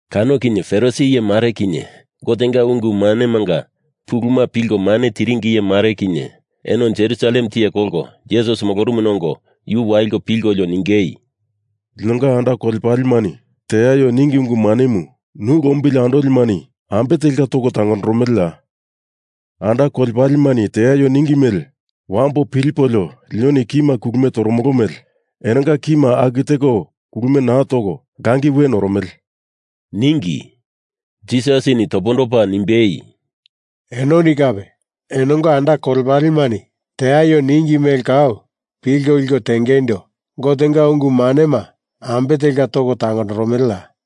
Kano kinye Farisi iye mare kinye, Gotenga ungu manemanga puluma pilko mane tiringi iye mare kinye eno Jerusalem tiye kolko Jisas molorumuna ongo yu waliko pilkolio ningei, “Linonga anda kolepalemani teaio ningi ungu manemu nu lombili andolimani ambe telka toko tangondoromeleya? Anda kolepalemani teaio ningi mele wambo pilipolio linoni kima kulumie toromolo mele enonga kima aku teko kulumie naa toko langi we noromele,” ningi. Jisasini topondopa nimbei, “Enoni kape enonga anda kolepalemani teaio ningi mele kau pilko liko tengeindo Gotenga ungu manema ambe telka toko tangondoromeleya?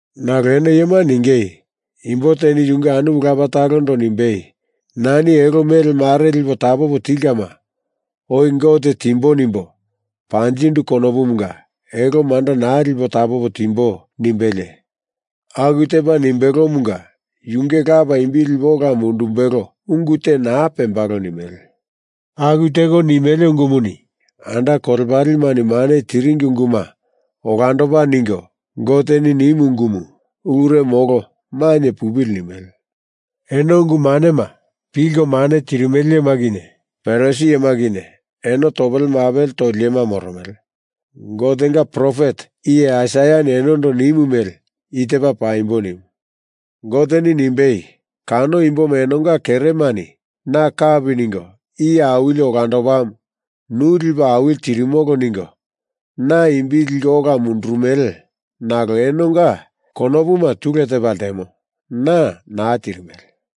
Nalo eno iyemani ningei, imbo teni yunge anumu lapa talondo nimbei nani elo mele mare lipo tapopo tilkama oi Gote timbo nimbo panjindu kanomunga elo manda naa lipo tapopo timbo nimbelie aku tepa nimbelomunga yunge lapa imbi lipe ola mundumbelo ungu te naa pembalo nimele. Aku teko nimele ungumuni anda kolepalemani mane tiringi unguma olandopa ningo Goteni nimu ungumu ulure molo mainye pupili nimele. Eno ungu manema pilko mane tirimele iyema kinye Farisi iyema kinye eno topele mapele toli iyema moromele! Gotenga profet iye Aisaiani enondo nimu mele i tepa paimbo nimu. Goteni nimbei, Kano imboma enonga keremani na kapi ningo Iye Awili olandopamu, nu lipo awili tirimolo ningo na imbi liko ola mundurumele nalo enonga konopuma tule tepa ltemo. Na naa tirimele.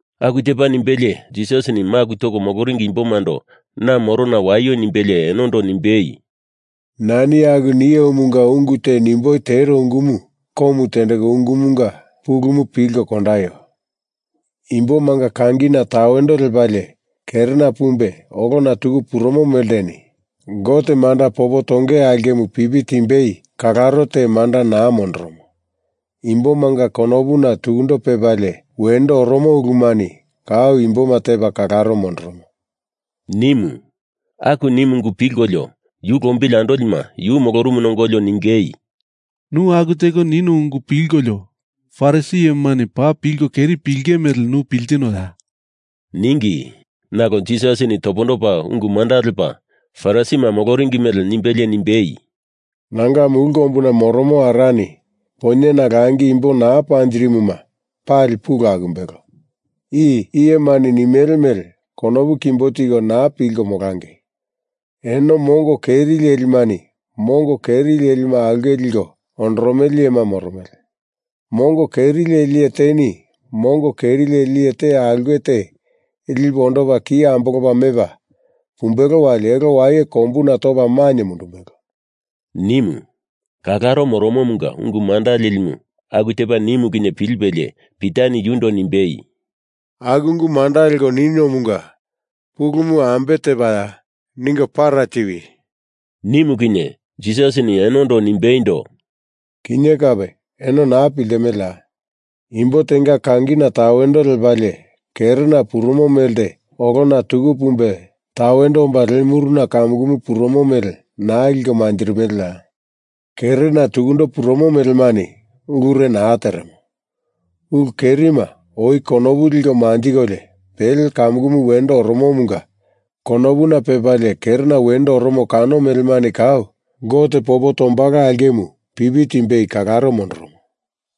Aku tepa nimbelie Jisasini maku toko moloringi imbomando na morona waio nimbelie enondo nimbei, “Nani aku niomunga ungu te nimboi tero ungumu komu tendeko ungumunga pulumu pilko kondaio. Imbomanga kangina tawendo lepalie kerena pumbe olona tuku purumo melteni Gote manda popo tonge aulkemu pipi timbei kalaro te manda naa mondoromo. Imbomanga konopuna tukundo pepalie wendo oromo ulumani kau imboma tepa kalaro mondoromo,” nimu. Aku nimu ungu pilkolio, yu lombili andolima yu molorumuna ongolio ningei “Nu aku teko nino ungu pilkolio Farisi iyemani paa pilko keri pilinge mele nu piltinoya?” ningi. Nalo Jisasini topondopa ungu manda lepa Farisima moloringi mele nimbelie nimbei, “Nanga mulu kombuna moromo Arani poinyena langi imbo naa panjirimuma pali pulu akumbelo. I iyemani nimele mele konopu kimbo tiko naa pilko molangei. Eno mongo keri lelimani mongo keri lelima aulke liko ondoromele iyema moromele. Mongo keri leli iye teni mongo keri leli iye te aulke te lipe ondopa ki ambolopa mepa pumbelo wali elo waye kombuna topa mainye mundumbelo,” nimu. Kalaro moromomunga ungu manda lelimu aku tepa nimu kinye pilipelie Pitani yundo nimbei, “Aku ungu manda leko niniomunga pulumu ambe tepaya? Ningo para tiwi,” nimu kinye Jisasini enondo nimbeindo, “Kinye kape eno naa piltimeleya? Imbo tenga kangina tawendo lepalie kerena purumo melte olona tuku pumbe tawendo omba le muruna kamukumu purumo mele naa liko manjirimeleya? Kerena tukundo purumo melemani ulure naa teremo. Ulu kerima oi konopu liko manjikolio pele kamukumu wendo oromomunga konopuna pepalie kerena wendo oromo kano melemani kau Gote popo tombalo aulkemu pipi timbei kalaro mondoromo.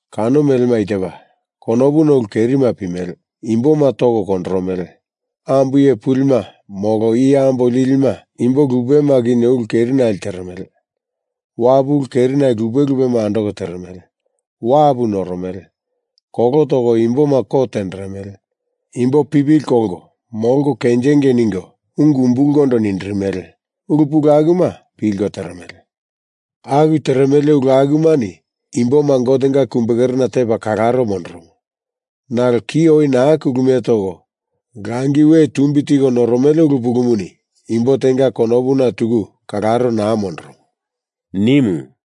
Kano melema i tepa: Konopuna ulu kerima pimele, imboma toko kondoromele, ambo iye pulima molo iye ambo lilima imbo lupema kinye ulu kerinale teremele, wapu ulu kerinali lupe lupema andoko teremele, wapu noromele, kolo toko imboma kot tenderemele, imboma pipili kolko molko kenjingei ningo ungu umbulkondo nindirimele, ulu pulu akuma pilko teremele. Aku teremele ulu akumani imboma Gotenga kumbekerena tepa kalaro mondoromo. Nalo ki oi naa kulumie toko langi we tumbi tiko noromele ulu pulumuni imbo tenga konopuna tuku kalaro naa mondoromo,” nimu.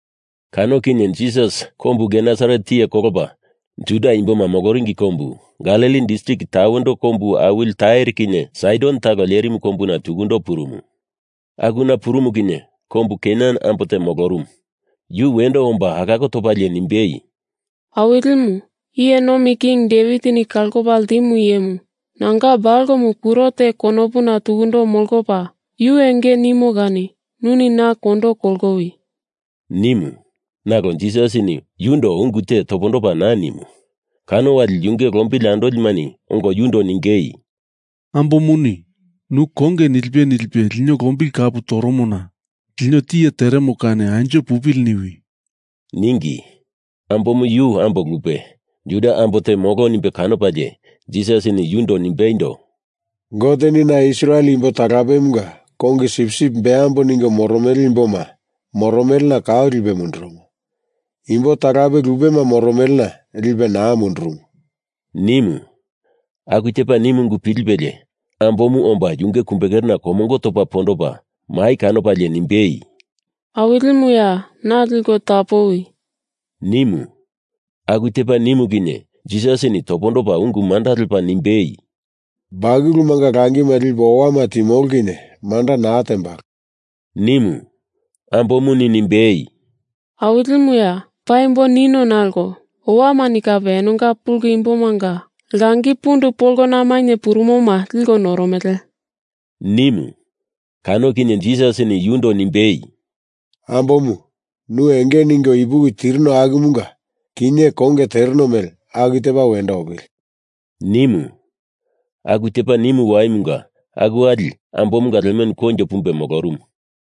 Kano kinye Jisas kombu Genesaret tiye kolopa Juda imboma moloringi kombu Galili distrik tawendo kombu awili Tair kinye Saidon talo lerimu kombuna tukundo purumu. Akuna purumu kinye kombu Kenan ambo te molorumu. Yu wendo omba alako topalie nimbei, “Awilimu, Iye Nomi King Devitini Kalopa Ltimu Iyemu, nanga balomu kuro te konopuna tukundo molopa yu enge nimo kani nuni na kondo kolowi!” nimu. Nalo Jisasini yundo ungu te topondopa naa nimu. Kano wali yu lombili andolimani ongo yundo ningei, “Ambomuni nu konge nilipe nilipe lino lombili kapu toromona lino tiye teremo kani anjo pupili niwi,” ningi. Ambomu yu ambo lupe, Juda ambo te molo nimbe kanopalie Jisasini yundo nimbeindo, “Goteni na Israel imbo talapemunga kongi sipsip beambo ningo moromele imboma moromelena kau lipe mundurumu. Imbo talape lupema moromelena lipe naa mundurumu,” nimu. Aku tepa nimu ungu pilipelie ambomu omba yunge kumbekerena komongo topa pondopa mai kanopalie nimbei, “Awilimuya, na liko tapowi,” nimu. Aku tepa nimu kinye Jisasini topondopa ungu manda lepa nimbei, “Bakulumanga langima lipo owama timolo kinye manda naa tembalo,” nimu. Ambomuni nimbei, “Awilimuya, paimbo nino nalo owamani kape enonga pulu imbomanga langi pundu polona mainye purumoma liko noromele,” nimu. Kano kinye Jisasini yundo nimbei, “Ambomu, nu enge ningo ipuki tirino akumunga kinye konge tereno mele aku tepa wendo opili,” nimu. Aku tepa nimu waimunga aku wali ambomunga lemenu koinjo pumbe molorumu.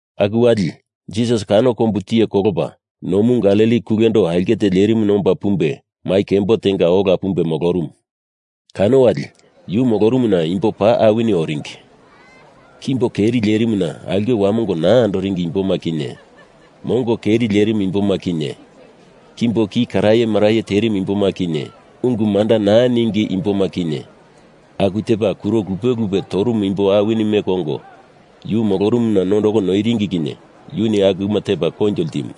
Aku wali Jisas kano kombumu tiye kolopa nomu Galili kulendo aulke te lerimuna omba pumbe mai kembo tenga ola pumbe molorumu. Kano wali yu molorumuna imbo paa awini oringi. Kimbo keri lerimuna aulke wamongo naa andoringi imboma kinye, mongo keri lerimu imboma kinye, kimbo ki karaye maraye terimu imboma kinye, ungu manda naa ningi imboma kinye, aku tepa kuro lupe lupe torumu imbo awini meko ongo yu molorumuna nondoko noiringi kinye yuni akuma tepa koinjo ltimu.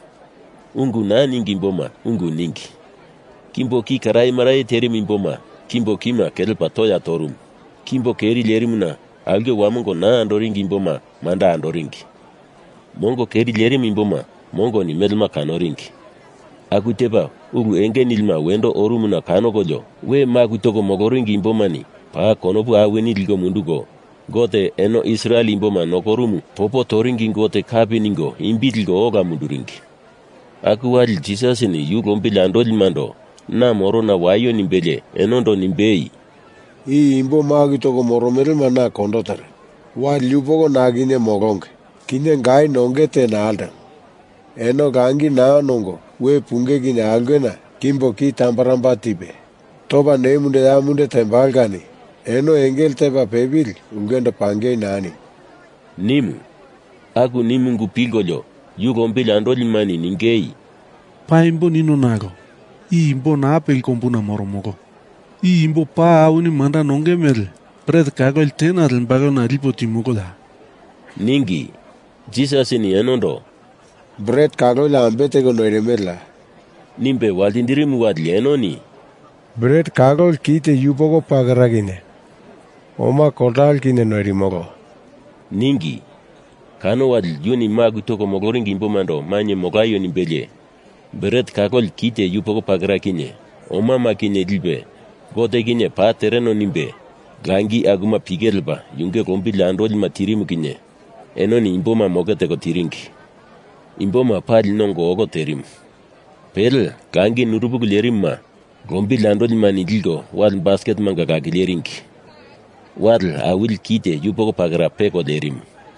Ungu naa ningi imboma ungu ningi. Kimbo ki karaye maraye terimu imbomanga kimbo kima kelepa toya torumu. Kimbo keri lerimuna aulke wamongo naa andoringi imboma manda andoringi. Mongo keri lerimu imboma mongoni melema kanoringi. Aku tepa ulu enge nilima wendo orumuna kanokolio we maku toko moloringi imbomani paa konopu awini liko munduko, Gote eno Israel imboma nokorumu popo toringi Gote kapi ningo imbi liko ola munduringi. Aku wali Jisasini yu lombili andolimando na morona waio nimbelie enondo nimbei, “I imbo maku toko moromelema na kondo teremo. Wali yupoko na kinye molonge, kinye gai nongei te naa ltemo. Eno langi naa nongo we punge kinye aulkena kimbo ki tambaramba tepa, topa ne munde ya munde tembalo kani eno engele tepa pepili ulkendo pangei naa nimbo,” nimu. Aku nimu ungu pilkolio yu lombili andolimani ningei, “Paimbo nino nalo i imbo naa peli kombuna moromolo. I imbo paa awini manda nonge mele bret kaloli tena lembalona lipo timoloya?” ningi. Jisasini enondo “Bret kaloli ambe teko noirimeleya?” nimbe waltindirimu wali enoni “Bret kaloli kite yupoko pakera kinye oma koltalo kinye noirimolo,” ningi. Kano wali yuni maku toko moloringi imbomando mainye molaio nimbelie, bret kaloli kite yupoko pakera kinye omama kinye lipe Gote kinye paa tereno nimbe, langi akuma pike lepa yu lombili andolima tirimu kinye enoni imboma moke teko tiringi. Imboma pali nongo olo terimu. Pele langi nurupulu lierimuma lombili andolimani liko wale basketemanga lakileringi. Wale awili kite yupoko pakera peko lerimu.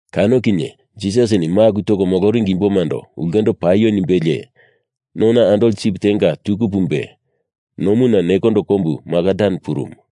Kano kinye Jisasini maku toko moloringi imbomando ulkendo paio nimbelie, nona andoli sip tenga tuku pumbe, nomuna nekondo kombu Magadan purumu.